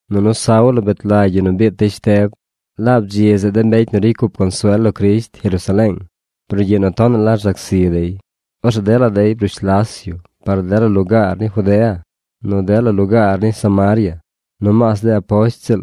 Nunu Saulo bet lagy yu nu biit dey Shteb. Laab dzi zeꞌ de mbecy nu ricy cup consuel lo Crisht Jerusaleeng brugyiꞌ nu tonaꞌ la rzac zi dey. Orzeꞌ dela dey brush las yu par dela lugaar ni Judea nu dela lugaar ni Samaria. Nomaas de aposht ziꞌl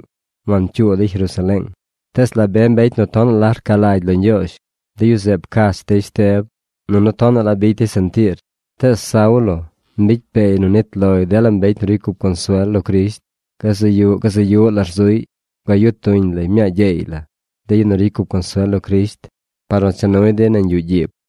wancyuu dey Jerusaleeng. Tees la be mbecy nu tonaꞌ la rca lagy lo Ñgyoozh, de yu zeꞌ pcach dey Shteb, nunu tonaꞌ la bicy dey sentiir. Tees Saulo mbicy peey nu nit loy dela mbecy nu ricy cup consuel lo Crisht. Gazaꞌ yuꞌ gazaꞌ yuꞌ la rzuꞌy. Bgayu tuñ lay mñaa gyeey la de yu nu ricy cup consuel lo Crisht par nu cha nuy dey nañ yuꞌ gyiib.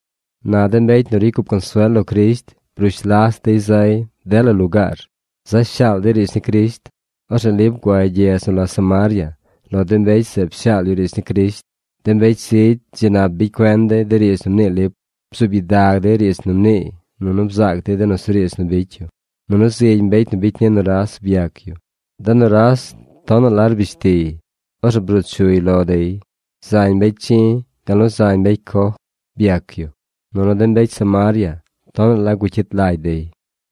Na de mbecy nu ricy cup consuel lo Crisht brush las dey zay dela lugaar. Za shaal dey riidz ni Crisht. Orzeꞌ Lip guay gyedz nu la Samaria. Lo de mbecy zeꞌ pshaal yu riidz ni Crisht. De mbecy zigy dzi nap bicy cuen dey de riidz nu mnii Lip. Bzuub gyidag dey riidz nu mniiy, nunu bzaac dey de nusuriidz nu bicy yu. Nunu zigy mbecy nu bicy ni nuras byac yu. De nuras tonaꞌ la rbish tiy. Orzeꞌ bruu chuy lo dey. Zañ mbecy chi̱, gal nu zañ mbecy coj byac yu. Nunu de mbecy Samaria tonaꞌ la gucyit lagy dey.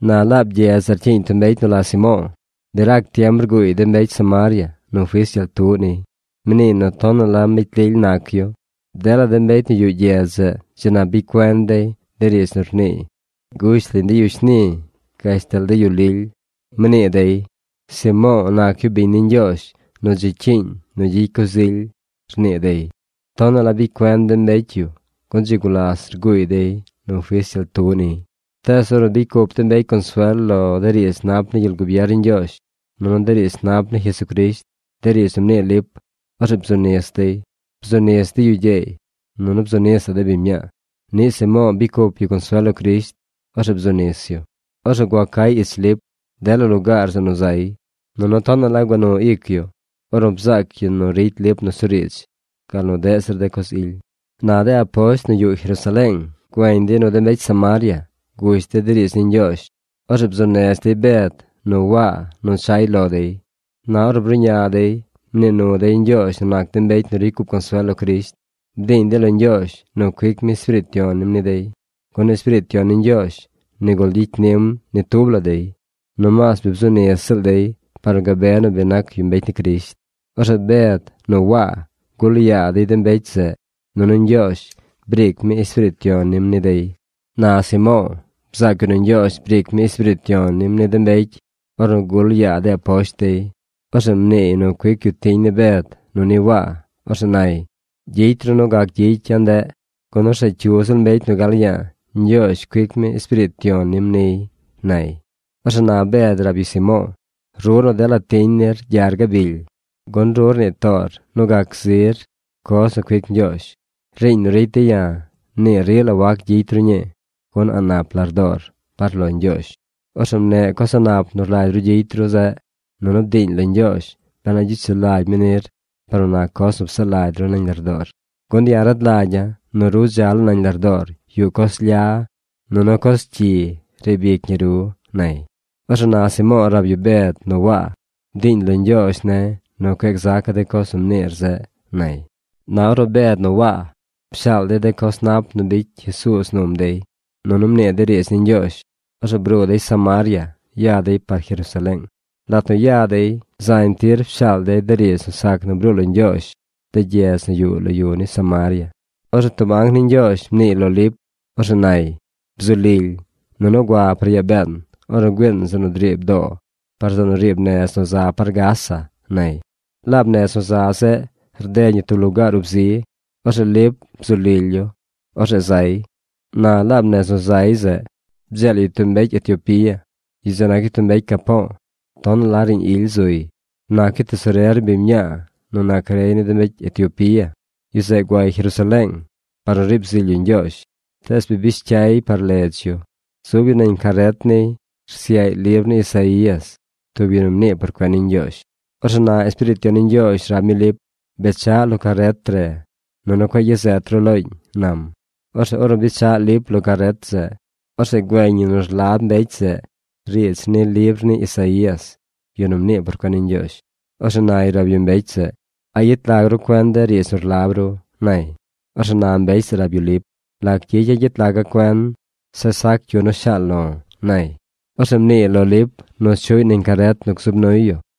Na laab gyedz zeꞌ rcyiiñ tub mbecy nu la Simo̱o̱. Bi rac tiem rguuy de mbecy Samaria nu fis gyel tuꞌ niy. Mniiy nu tonaꞌ la mbecy lily nac yu. Dela mbecy nu yuꞌ gyedz zeꞌ dzi nap bicy cuen dey de riidz nu rniiy gush lañ de yu shni gashtal de yu lily. Mnii dey: ―Simo̱o̱ nac yu biñ ni Ñgyoozh nu dzi cyiiñ nu gyicy coz ily ―rnii dey. Tonaꞌ la bicy cuen de mbecy yu gun dzi gulas rguuy dey nu fis gyel tuꞌ niy. Tees ornu bicy cup de mbecy consuel lo de riidz nap ni gyel gubier ni Ñgyoozh nunu de riidz nap ni Jesucrisht, de riidz nu mnii Lip, orzeꞌ bzu nis dey. Bzu nis de yu gyeey nunu bzu nisaꞌ de biñ mñaa. Niꞌ Simo̱o̱ bicy cup yu consuel lo Crisht. Ornu bzu nis yu, orzeꞌ gua cay ich Lip dela lugaar zeꞌ nu zay, nunu tonaꞌ la gua nu ic yu ornu bzaac yu nu ricy Lip nusuriidz, gal nu deꞌ zir de coz ily. Na de aposht nu yuꞌ Jerusaleeng güeñ dey nu de mbecy Samaria gush dey de riidz ni Ñgyoozh. Orzeꞌ bzuu nez dey Bed nu Waa nu chay lo dey. Na ornu bruꞌña dey, mnii nu dey Ñgyoozh nu nac de mbecy nu ricy cup consuel lo Crisht. Bdiiñ dey lo Ñgyoozh nu cuic mi Espiriit Yon nim ni dey, gun Espiriit Yon ni Ñgyoozh nigul gyicy nim ni tub la dey. Nomaas nu bi bzu nis ziꞌl dey par nu gabe nu nac yu mbecy ni Crisht. Orzeꞌ Bed nu Waa gul yaa dey de mbecy zeꞌ, nunu Ñgyoozh briic mi Espiriit Yon nim ni dey. Na Simo̱o̱ bzaac yu nu Ñgyoozh briic mi Espiriit Yon nim ni de mbecy ornu gul yaa de aposht dey. Orzeꞌ mniiy nu cuic yu tiñ ni Bed nu ni Waa. Orzeꞌ nay: ―Gyicy ru nu gac gyicy ya̱ ndeꞌ, gun orzeꞌ cyu ziꞌl mbecy nu gal ya̱a̱ Ñgyoozh cuic mi Espiriit Yon nim niy ―nay. Orzeꞌ na Bed rab yu Simo̱o̱: ―¡Ru nu dela tiñ nir gyar gabily! Gun ru rnii toor nu gac zir coz nu cuic Ñgyoozh. Riiñ nu ricy de̱ ya̱ nii rila wac gyicy ru ñii, gun a̱ꞌ nap lardoor par lo Ñgyoozh. Orzeꞌ mneꞌ coz a̱ꞌ nap nu rlagy ru gyicy ru zeꞌ nunu bdiiñ lo Ñgyoozh ben a gyicy sulagy mi nir par nu nac coz nu psaꞌ lagy ru nañ lardoor. Gun ya̱ rad lagya̱ nu ru dza laa nañ lardoor yuꞌ coz lya nunu coz cyi riib ic ñi ru ―nay. Orzeꞌ na Simo̱o̱ rab yu Bed nu Waa: ―Bdiiñ lo Ñgyoozh ne̱ nu cueꞌ gzaca̱ de coz nu mniir zeꞌ ―nay. Na ornu Bed nu Waa pshaal dey de coz nap nu bicy Jesuuz num dey, nunu mnii dey riidz ni Ñgyoozh, orzeꞌ bruu dey Samaria ya dey par Jerusaleeng. Lat nu ya dey, zañ tir pshaal dey de riidz nu sac nu bruu lo Ñgyoozh de gyedz nu yuꞌ lo yu ni Samaria. Orzeꞌ tub anc ni Ñgyoozh mniiy lo Lip. Orzeꞌ nay: ―Bzu lily, nunu gua par yaa been ornu güiin zeꞌ nu driib doo par zeꞌ nu riib nez nu za par Gaza ―nay. Laab nez nu za zeꞌ rded ñi tub lugaar ub zi. Orzeꞌ Lip bzu lily yu. Orzeꞌ zay. Na laab nez nu zay zeꞌ bdzeel yu tub mbecy Etiopía. Yu zeꞌ nac yu mbecy capo̱o̱. Tonaꞌ la riiñ ily zuy. Nac yu tesorer ni biñ mñaa nu nac rey ni de mbecy Etiopía. Yu zeꞌ guay Jerusaleeng par nu riib zily yu Ñgyoozh, bi bish cyay yay par ledz yu. Zub yu nañ caret niy rsyaꞌy libr ni Isaías, tub yu nu mnii por cuen ni Ñgyoozh. Orzeꞌ na Espiriit Yon ni Ñgyoozh rab mi Lip: ―Bechaꞌ lo caret re, nunu cueꞌ gyazet ru looñ ―nam. Orzeꞌ ornu bechaꞌ Lip lo caret zeꞌ, orzeꞌ güeñ yu nu rlab mbecy zeꞌ riidz ni libr ni Isaías, yu nu mnii por cuen ni Ñgyoozh. Orzeꞌ nay rab yu mbecy zeꞌ: ―¿A yet lag ru cuen de riidz nu rlab ru? ―nay. Orzeꞌ na mbecy zeꞌ rab yu Lip: ―¿Lac gyicya̱ gyet laga̱ cuen, zeꞌ sac cyu yu nu shaal lo̱? ―nay. Orzeꞌ mniiy lo Lip nu chuꞌy nañ caret nu gzub nuy yu.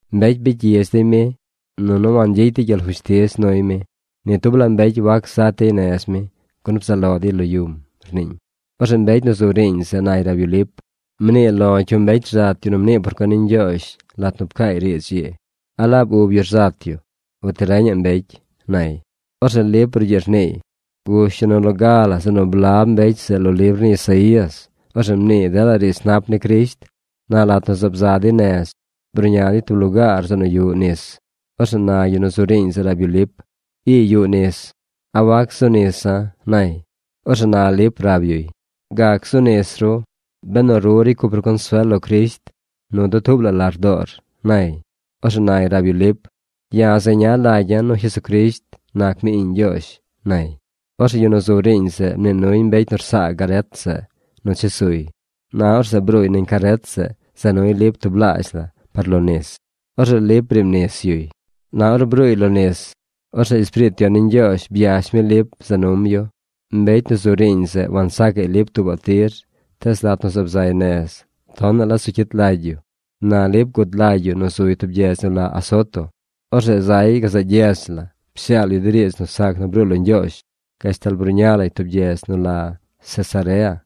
Mbecy bicy gyidz dey mi, nunu wangyicy dey gyel fushtiz nuy mi. Ni tub la mbecy wac zat dey nez mi, gun bzaꞌ lo dey lo yum, rniiñ. Orzeꞌ mbecy nu zu riiñ zeꞌ nay rab yu Lip: ―Mnii lo̱ cyu mbecy rzat yu nu mnii por cuen ni Ñgyoozh lat nu pcaay riidz ii. ¿A laab ub yu rzat yu uti reñaꞌ mbecy? ―nay. Orzeꞌ Lip brugyiꞌ rniiy. Gush yu nu loga la zeꞌ nu blab mbecy zeꞌ lo libr ni Isaías. Orzeꞌ mniiy dela riidz nap ni Crisht. Na lat nu zaab za dey nez, bruꞌña dey tub lugaar zeꞌ nu yuꞌ nis. Orzeꞌ na yu nu zu riiñ zeꞌ rab yu Lip: ―Ii yuꞌ nis. ¿A wac zu nisa̱? ―nay. Orzeꞌ na Lip rab yuy: ―Gac zu nis ru, benu ru ricy cup ru consuel lo Crisht nu dutuub la lardoor ―nay. Orzeꞌ nay rab yu Lip: ―Ya̱ zeña lagya̱ nu Jesucrisht nac mi Iꞌñ Ñgyoozh ―nay. Orzeꞌ yu nu zu riiñ zeꞌ mnii nuy mbecy nu rsaa caret zeꞌ nu chesuy. Na orzeꞌ bruuy nañ caret za nuy Lip tublaazh la par lo nis. Orzeꞌ Lip briib nis yuy. Na ornu bruuy lo nis, orzeꞌ Espiriit Yon ni Ñgyoozh byash mi Lip za num yu. Mbecy nu zu riiñ zeꞌ wansaacaꞌy Lip tuubaꞌ tir, tees lat nu zaab zay nez, tonaꞌ la zu cyit lagy yu. Na Lip gud lagy yu nu zuy tub gyedz nu la Azoto. Orzeꞌ zay gazaꞌ gyedz la pshaal yu de riidz nu sac nu bruu lo Ñgyoozh gashtal bruꞌña lay tub gyedz nu la Cesarea.